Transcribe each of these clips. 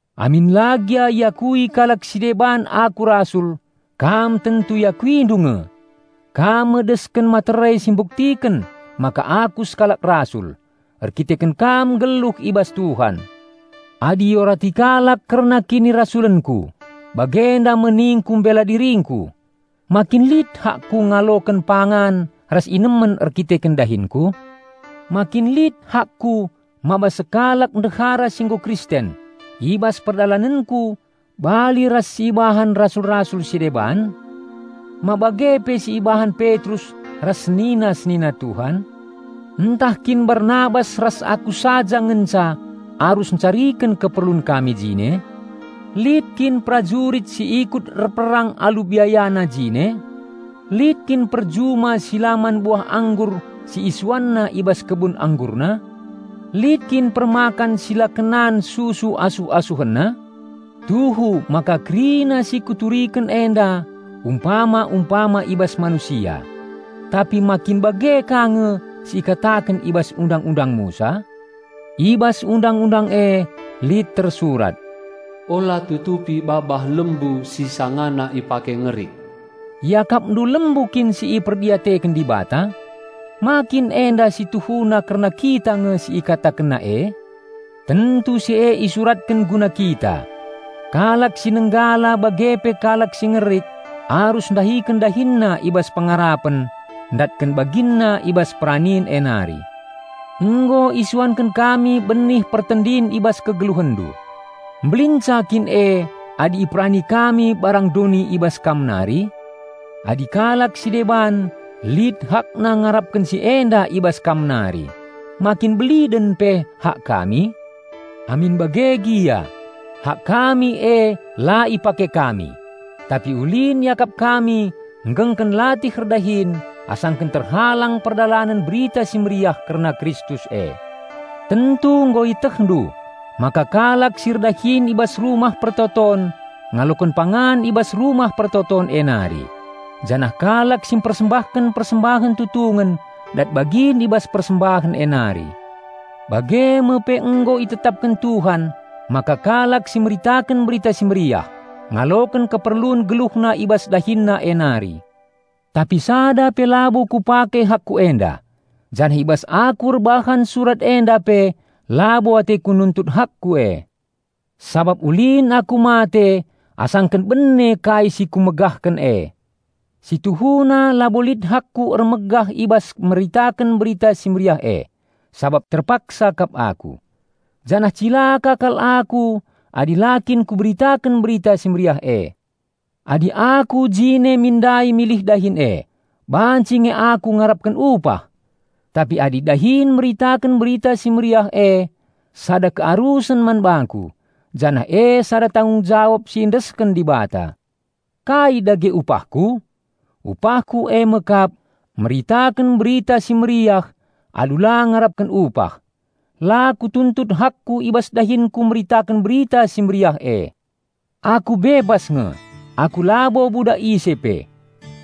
Amin la gia iakui kalak si deban aku rasul, kam tentu iakuindu nge! Kam me desken materai si mbuktiken maka aku sekalak rasul, erkiteken kam nggeluh i bas Tuhan. Adi iorati kalak kerna kinirasulenku, bagenda me ningku mbela diringku: Ma kin lit hakku ngaloken pangan ras inemen erkiteken dahinku? Ma kin lit hakku mbaba sekalak ndehara si nggo Kristen i bas perdalanenku bali ras si ibahan rasul-rasul si deban? Ma bage pe si ibahan Petrus ras senina-senina Tuhan? Ntah kin Barnabas ras aku saja ngenca arus ncariken keperlun kami jine? Lit kin perajurit si ikut erperang alu biayana jine? Lit kin perjuma si la man buah anggur si isuanna i bas kebun anggurna? Lit kin permakan si la kenan susu asuh-asuhenna? Tuhu maka kerina si kuturiken enda umpama-umpama i bas manusia; tapi ma kin bage ka nge si ikataken i bas Undang-undang Musa? I bas Undang-undang e lit tersurat, "Ula tutupi babah lembu si sangana ipake ngerik." Iakapndu lembu kin si iperdiateken Dibata? Ma kin enda si tuhuna kerna kita nge si ikatakenna e? Tentu si e isuratken guna kita. Kalak si nenggala bage pe kalak si ngerik arus ndahiken dahinna i bas pengarapen ndatken baginna i bas peranin e nari. Nggo isuanken kami benih pertendin i bas kegeluhenndu. Mbelinca kin e adi iperani kami barang doni i bas kam nari? Adi kalak si deban lit hakna ngarapken si enda i bas kam nari, ma kin beliden pe hak kami? Amin bage gia, hak kami e la ipake kami. Tapi ulin iakap kami nggengken latih erdahin asangken terhalang perdalanen Berita Si Mehuli kerna Kristus e. Tentu nggo ietehndu maka kalak si erdahin i bas Rumah Pertoton ngaloken pangan i bas Rumah Pertoton e nari, janah kalak si mpersembahken persembahen tutungen dat bagin i bas persembahen e nari. Bage me pe nggo itetapken Tuhan maka kalak si meritaken Berita Si Mehuli ngaloken keperlun geluhna i bas dahinna e nari. Tapi sada pe labo kupake hakku enda, janah i bas aku erbahan surat enda pe labo ateku nuntut hakku e. Sabap ulin aku mate asangken bene kai si kumegahken e. Si tuhuna labo lit hakku ermegah i bas meritaken Berita Si Mehuli e, sabap terpaksa kap aku. Janah cilaka kal aku adi la kin kuberitaken Berita Si Mehuli e. Adi aku jine min ndai milih dahin e, banci nge aku ngarapken upah. Tapi adi dahin meritaken Berita Si Mehuli e sada kearusen man bangku, janah e sada tanggung jawab si iendesken Dibata. Kai dage upahku? Upahku me kap: meritaken Berita Si Mehuli alu la ngarapken upah. La kutuntut hakku i bas dahinku meritaken Berita Si Mehuli e. Aku bebas nge; aku labo budak ise pe.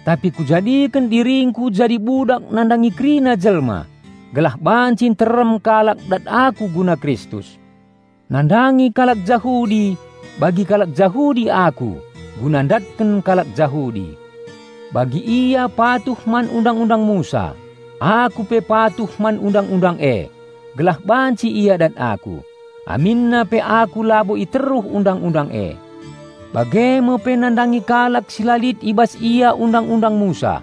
Tapi kujadiken diringku jadi budak nandangi kerina jelma gelah banci nterem kalak dat aku guna Kristus. Nandangi kalak Jahudi bagi kalak Jahudi aku guna ndatken kalak Jahudi. Bagi ia patuh man Undang-undang Musa, aku pe patuh man Undang-undang e, gelah banci ia dat aku, aminna pe aku labo i teruh Undang-undang e. Bage me pe nandangi kalak si la lit i bas ia Undang-undang Musa,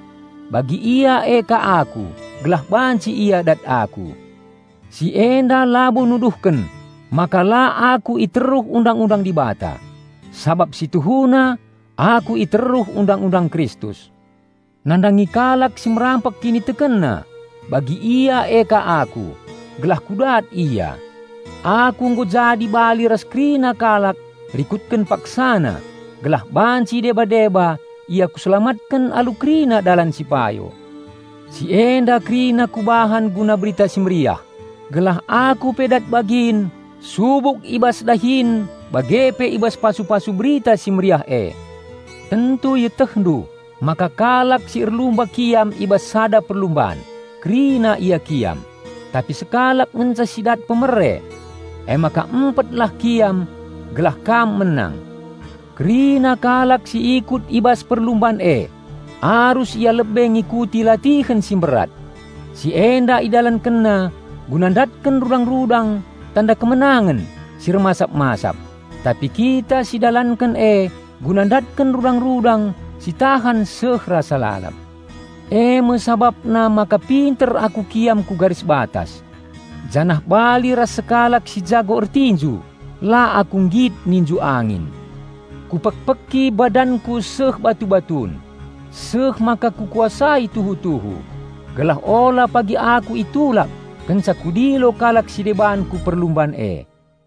bagi ia e ka aku, gelah banci ia dat aku. Si enda labo nuduhken maka la aku i teruh Undang-undang Dibata, sabap si tuhuna aku i teruh Undang-undang Kristus. Nandangi kalak si merampek kinitekenna, bagi ia e ka aku, gelah kudat ia. Aku nggo jadi bali ras kerina kalak rikutken paksana gelah banci deba-deba ia kuselamatken alu kerina dalan si payo. Si enda kerina kubahan guna Berita Si Mehuli, gelah aku pe dat bagin subuk i bas dahin bage pe i bas pasu-pasu Berita Si Mehuli e. Tentu ietehndu maka kalak si erlumba kiam i bas sada perlumban, kerina ia kiam, tapi sekalak ngenca si dat hadiah. Emaka empetlah kiam gelah kam menang. Kerina kalak si ikut i bas perlumban e arus ia lebe ngikuti latihen si mberat. Si enda idalankenna guna ndatken rudang-rudang tanda kemenangen si ermasap-masap; tapi kita sidalanken e guna ndatken rudang-rudang si tahan seh rasa lalap. Eme sabapna maka pinter aku kiam ku garis batas. Janah bali ras sekalak si jago ertinju, la aku nggit ninju angin. Kupekpeki badanku seh batu-batun, seh maka kukuasai tuhu-tuhu, gelah ula pagi aku itulak kenca kudilo kalak si deban ku perlumban e.